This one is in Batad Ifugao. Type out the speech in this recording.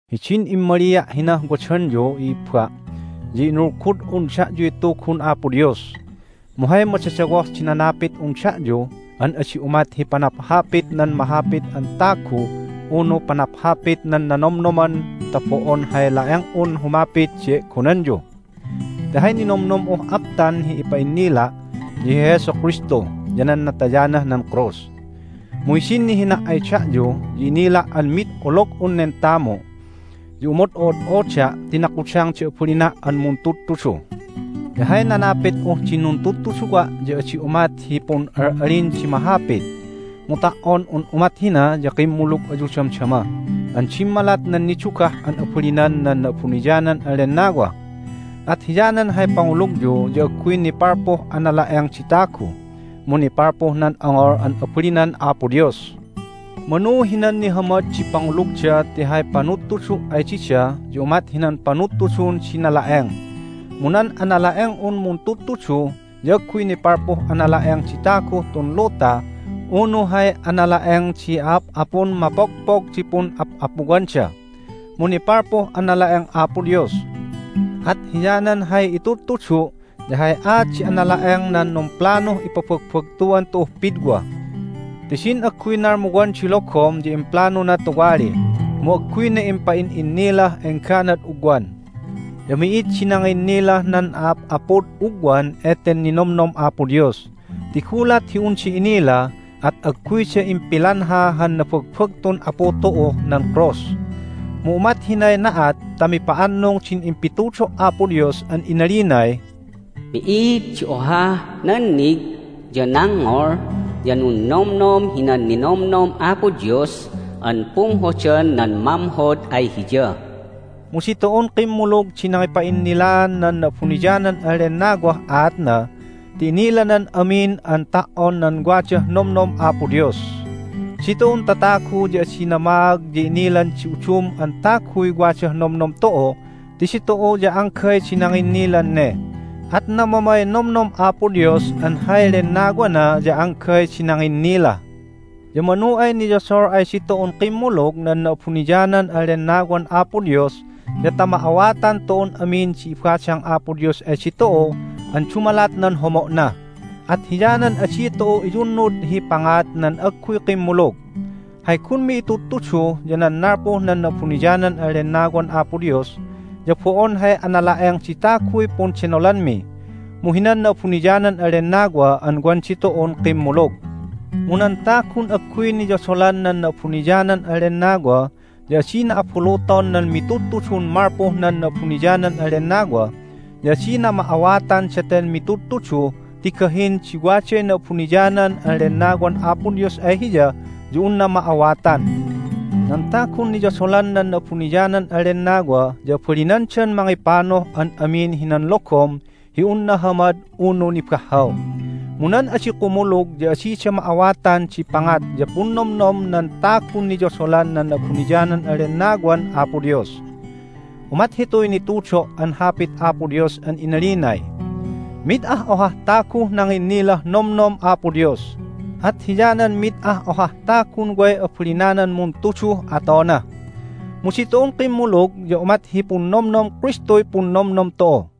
Hidin immalia' hinah wadanyu, i'ibba, ya inulgud'un da'yuy Tugun Apo Dios. Mu hay madadawoh di nanapit'un da'yu an adi umat hi panaphapit nan mahapit an tagu unu panaphapit nan nanomnoman ta bo'on hay la'eng'un humapit di e'gonanyu, ti hay ninomnom'uh aptan hi ipa'innila' ya hi Jesu Kristu ya nan natayanah nan krus. Mu hidin nihina' ay da'yu ya inila' an mid olog'un nen tamu, ya umod'o'od'oda' ti nakudang di abalina' an muntudtudu. Ya hay nanapit'uh din nuntudtuduwa' ya adi umat hi pun'al'alin di mahapit. Mu ta"on un umat hina ya kimmulug ayu damdama an dimmalat nan nidugah an abalinan nan Na'abuniyanan an Lennawa. At hiyanan hay pangulugyu ya agguy nipalpuh anala'eng di tagu, mu nipalpuh nan ongol an abalinan Apo Dios. Manu hinan nihamad di pangulugda ti hay panudtudu' ay dida ya umat hinan panudtudun di nala'eng, mu nan anala'eng'un muntudtudu ya agguy nipalpuh anala'eng di taguh tun luta unu hay anala'eng di a'ap'apun mapogpog di pun'ap'apuwanda, mu nipalpuh anala'eng Apo Dios. At hiyanan hay itudtudu' ya hay aat di anala'eng nan numplanuh ipabagbagtuan tu'uh pidwa. Ti din agguy nalmuwan di logom ya implanuna tuwali, mu agguyna impa'in'innilah engganad ugwan. Ya mi'id di nanginnilah nan a'ap'apud ugwan eten ninomnom Apo Dios, ti gulat hi unda inila at agguyda impilanha han nabagbagtun Apu tu'uh nan krus. Mu umat hinay na'at ta mipa'annung din impitudo' Apo Dios an inalinay, "Mi'id di ohah nannig, ya nangngol, ya nunnomnom hinan ninomnom Apo Dios an pumhodan nan mamhod ay Hiya." Mu ditu'un kimmulug di nangipa'innilaan nan Na'abuniyanan an Lennawah aatna, ti inilanan amin an ta"on nan wadah nomnom Apo Dios. Ditu'un tatagu ya adi namaag ya inilan di udum an taguy wadah nomnom tu'u ti ditu'u ya anggay di nanginnilan ne. At namamay nomnom Apo Dios an hay Lennawana ya anggay di nanginnila. Ya manu ay niyodol ay ditu'un kimmulug nan Na'abuniyanan an Lennawan Apo Dios ya ta ma'awatan tu'un amin di ibadang Apo Dios ay ditu'u an dumalat nan homo'na. At hiyanan adi tu'u iyunnud hi pangat nan agguy kimmulug. Hay gunmi itudtudu ya nan nalpuh nan Na'abuniyanan an Lennawan Apo Dios, ya bo'on hay anala'eng di taguy pundenolanmi, mu hinan Na'abuniyanan an Lennawa an wan ditu'un kimmulug. Mu nan tagun agguy niyodolan nan Na'abuniyanan an Lennawa ya adina abuluton nan mitudtudun malpuh nan Na'abuniyanan an Lennawa, ya adina ma'awatan daten mitudtudu ti gahin di waday Na'abuniyanan an Lennawan Apo Dios ay hiya ya unna ma'awatan. Nan tagun niyodolan nan Na'abuniyanan an Lennawa ya abalinandan mangipanuh an amin hinan logom hi un nahamad unu nibahhaw. Mu nan adi kumulug ya adida ma'awatan di pangat ya punnomnom nan tagun niyodolan nan Na'abuniyanan an Lennawan Apo Dios. Umat hituy nitudo' an Hapit Apo Dios an inalinay, "Mid ah ohah taguh nanginnilah nomnom Apo Dios, at hiyanan mid ah ohah tagun way abalinanan muntuduh atona." Mu ditu'un kimmulug ya umat hi punnomnom Kristuy punnomnom tu'u.